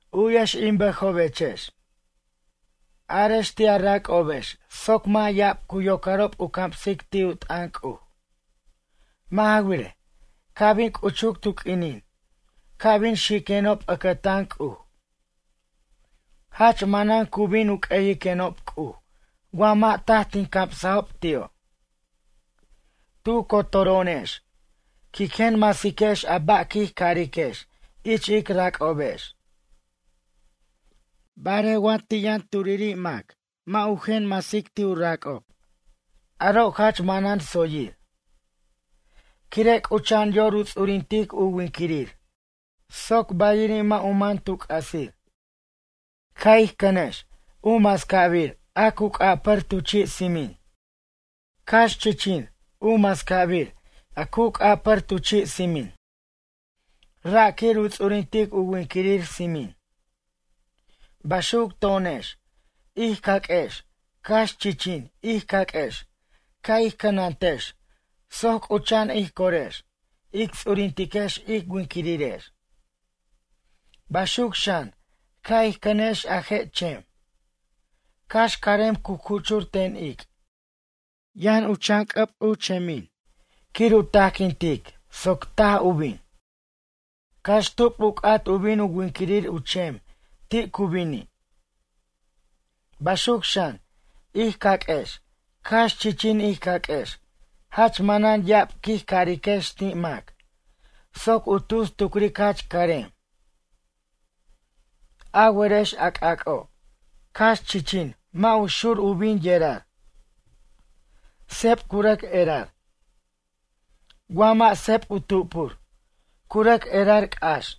U'yex in bʌjobechex. Arex ti' a rac'obex soc mʌ' ya'ab cu yocarob u camsic ti' u t'ʌn C'uj. Mʌ' ja wirej, ca' bin c'uchuc tu q'uinin ca' bin xiquenob ʌcʌtan C'uj. Jach manan cu bin u q'ueyiquenob C'uj wa mʌ' taj tin camsajob ti'o'. Tu cotoro'onex quic jen masiquex a ba' quij cariquex ich ic rac'obex. Barej wa ti' yʌn turiri' mac mʌ' u jen masic ti' u rac'ob, aro' jach manan tsoyir. Quire' c'ucha'an yor u ts'urintic u winquirir soc bayiri' mʌ' u man tu c'asir. Ca' ij cʌnex u mascabir a c'apar tu chi' tsimin. Cax chichin u mascabir a cu c'apar tu chi' tsimin. Ra' quir u ts'urintic u winquirir tsimin. Baxuc to'onex ij caq'uex cax chichin ij caq'uex ca' ij cʌnantex soc c'ucha'an ij corex, ic ts'urintex ic winquirirex. Baxuc xan ca' ij cʌnex a je' chem. Cax carem cu cuchur ten ic'. Yʌn u chan c'ʌb u chemin quir u tajquintic soc taj u bin. Cax tub u c'at bin u winquirir u chem ti' cu bini'. Baxuc xan ij caq'uex cax chichin ij caq'uex jach manan ya'ab quij cariquex ti' mac, soc u tus tucric jach carem. A werex a c'ac'o', cax chichin mʌ' u xur u bin u yerar. Seb cu rʌc erar. Wa mʌ' seb u tupur, cu rʌc erar c'ax.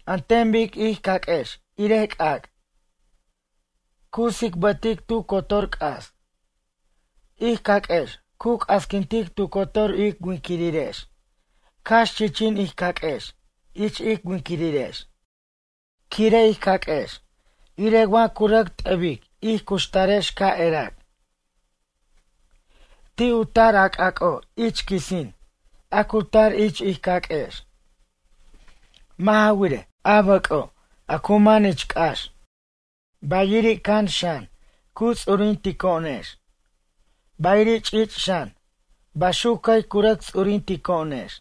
An ten bic ij caq'uex irej c'ac'. Cu tsicbʌtic tu cotor c'as. Ij caq'uex cu c'asquintic tu cotor ic winquirirex cax chichin ij caq'uex ich ic winquirirex quire' ij caq'uex irej wa cu rʌc t'ʌbic ij cuxtarex ca' erac. Ti' u tar a c'ac'o' ich quisin a cu tar ich ij caq'uex. Mʌ' ja wirej, a bʌc'o' a cu man ich c'ax. Bayiri' can xan cu ts'urintico'onex. Bayiri' ch'ich' xan baxuc cʌy cu rʌc ts'urintico'onex.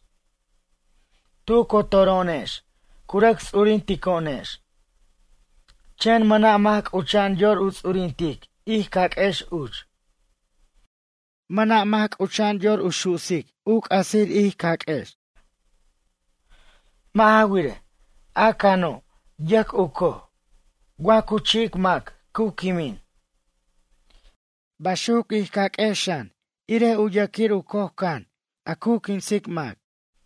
Tu cotoro'onex cu rʌc ts'urintico'onex. Chen mʌna' mac c'ucha'an yor u ts'urintic ij caq'uex uch. Mʌna' mac c'ucha'an yor u su'sic u c'asir ij caq'uex. Mʌ' ja wirej, a cano' yʌc u coj, wa cu chi'ic mac cu quimin. Baxuc ij caq'uex xan irej yʌquir u coj can a cu quinsic mac.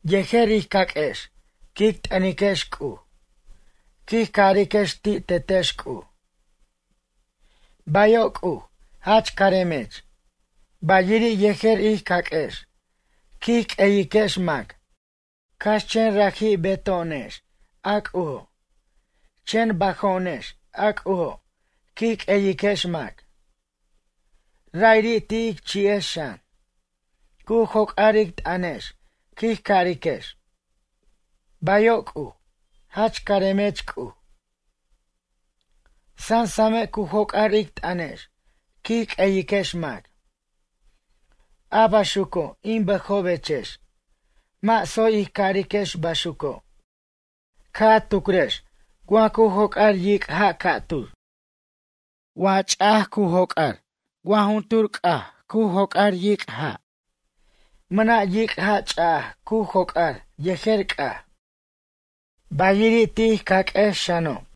Yejer ij caq'uex quic t'ʌniquex C'uj. Quij cariquex ti' Tetex C'uj: “Bayo' C'uj jach caremech.” Bayiri' yejer ij caq'uex quij q'ueyiquex mac cax chen raji' beto'onex a C'ujo', chen bajo'onex a C'ujo', quic q'ueyiquex mac. Ra'iri' ti' ic chi'ex xan, cu joc'ar ic t'ʌnex quij cariquex: “Bayo' C'uj, jach caremech C'uj.” Sʌsame' cu joc'ar ic t'ʌnex quij q'ueyiquex mac. A baxuco' in bʌjobechex mʌ' tsoy ij cariquex baxuco'. Ca' a tucrex wa cu joc'ar yic' ja' ca'tur. Wa ch'aja cu joc'ar wa juntur c'aj cu joc'ar yic' ja'. Mʌna' yic' ja' ch'aja cu joc'ar yejer c'aj. Bayiri' ti' ij caq'uex xano'.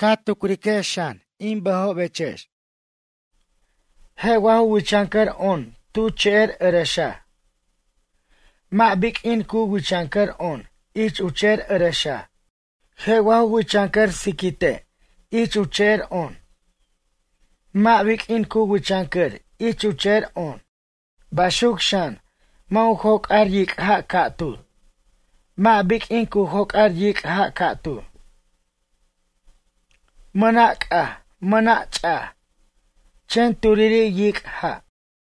Ca' tucrex xan in bʌjobechex. Je' wa ju wichʌncʌr on tu che'er ʌrʌxaj. Mʌ' biq'uin cu wichʌncʌr on ich u che'er ʌrʌxaj. Je' wa ju wichʌncʌr siquite' ich u che'er on. Mʌ' biq'uin cu wichʌncʌr ich u che'er on. Baxuc xan mʌ' u joc'ar yic' ja' ca'tur, mʌ' biq'uin cu joc'ar yic' ja' ca'tur. Mʌna' c'aj, mʌna' ch'aj, chen turiri' yic' ja'.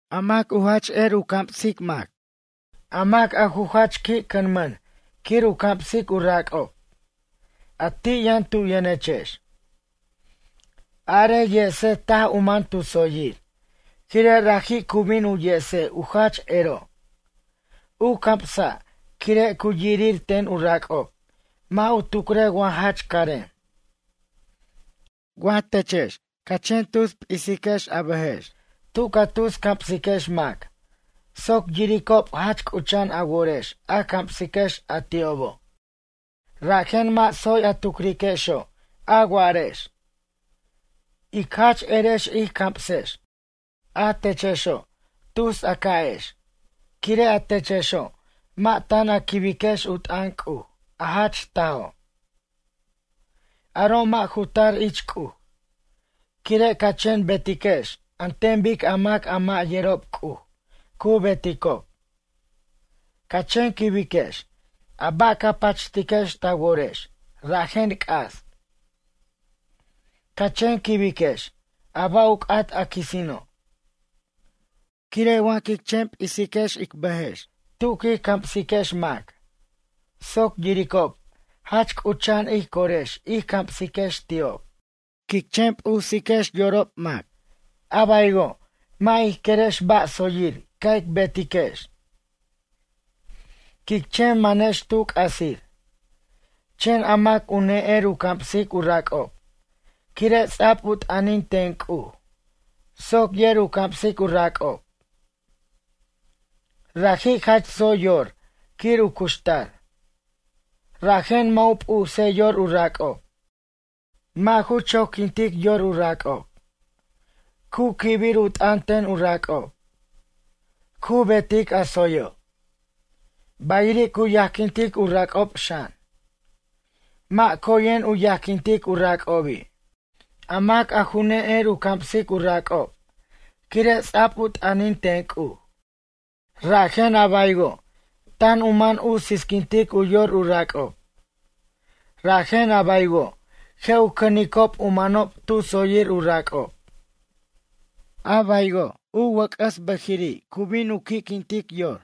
A mac a ju jach qui' cʌmʌn quir u camsic u rac'ob, a ti' yʌn tu yʌnechex. Arej yese taj u man tu tsoyir quire' raji' cu bin u yese u jach ero' u camsa' quire' cu yirir ten u rac'ob mʌ' u tucrej wa jach carem. Wa techex ca chen tus p'isex a bʌjex tu ca tus camsiquex mac soc yiricob jach c'ucha'an a worex a camsiquex a ti'obo'. Rajen mʌ' tsoy a tucriquexo' a wa'arex: “Ic jach erex ij camsex.” A techexo' tus a ca'ex quire' a techexo' mʌ' tan a quibex u t'ʌn C'uj, a jach tajo'. Aro' mʌ' ju tar ich C'uj. Quire' ca chen betiquex an ten bic a mac a mʌ' yerob C'uj cu beticob. Ca chen quibiquex a ba' ca pachtiquex ta worex rajen c'as. Ca chen quibiquex a ba' u c'at a quisino'. Quire' wa quic chen p'is ic bʌjex tu quic camsiquex mac soc yiricob jach c'ucha'an ij cor ij camsiquex ti'ob, quic chen p'us yorob mac, a baywo' mʌ' ij querex ba' tsoyir ca' ic betiquex. Quic chen manex tu c'asir. Chen a mac u ne'er u camsic u rac'ob quire' ts'ab u t'ʌnin ten C'uj soc yer u camsic u rac'ob. Raji' jach tsoy yor quir u cuxtar. Rajen mʌ' u p'usej yor u rac'ob. Mʌ' ju choquintic yor u rac'ob. Cu quibir u t'ʌn ten u rac'ob. Cu betic a tsoyo'. Bayiri' cu yajquintic u rac'ob xan. Mʌ' coyen u yajquintic u rac'obi'. A mac a ju ne'er u camsic u rac'ob quire' ts'a'b u t'ʌnin ten C'uj. Rajen a baywo', tan u man u sisquint u yor u rac'ob. Rajen a baywo' je' u cʌnicob u manob tu tsoyir u rac'ob. A baywo' u wʌc'ʌs u bʌjiri' cu bin u qui'quintic yor.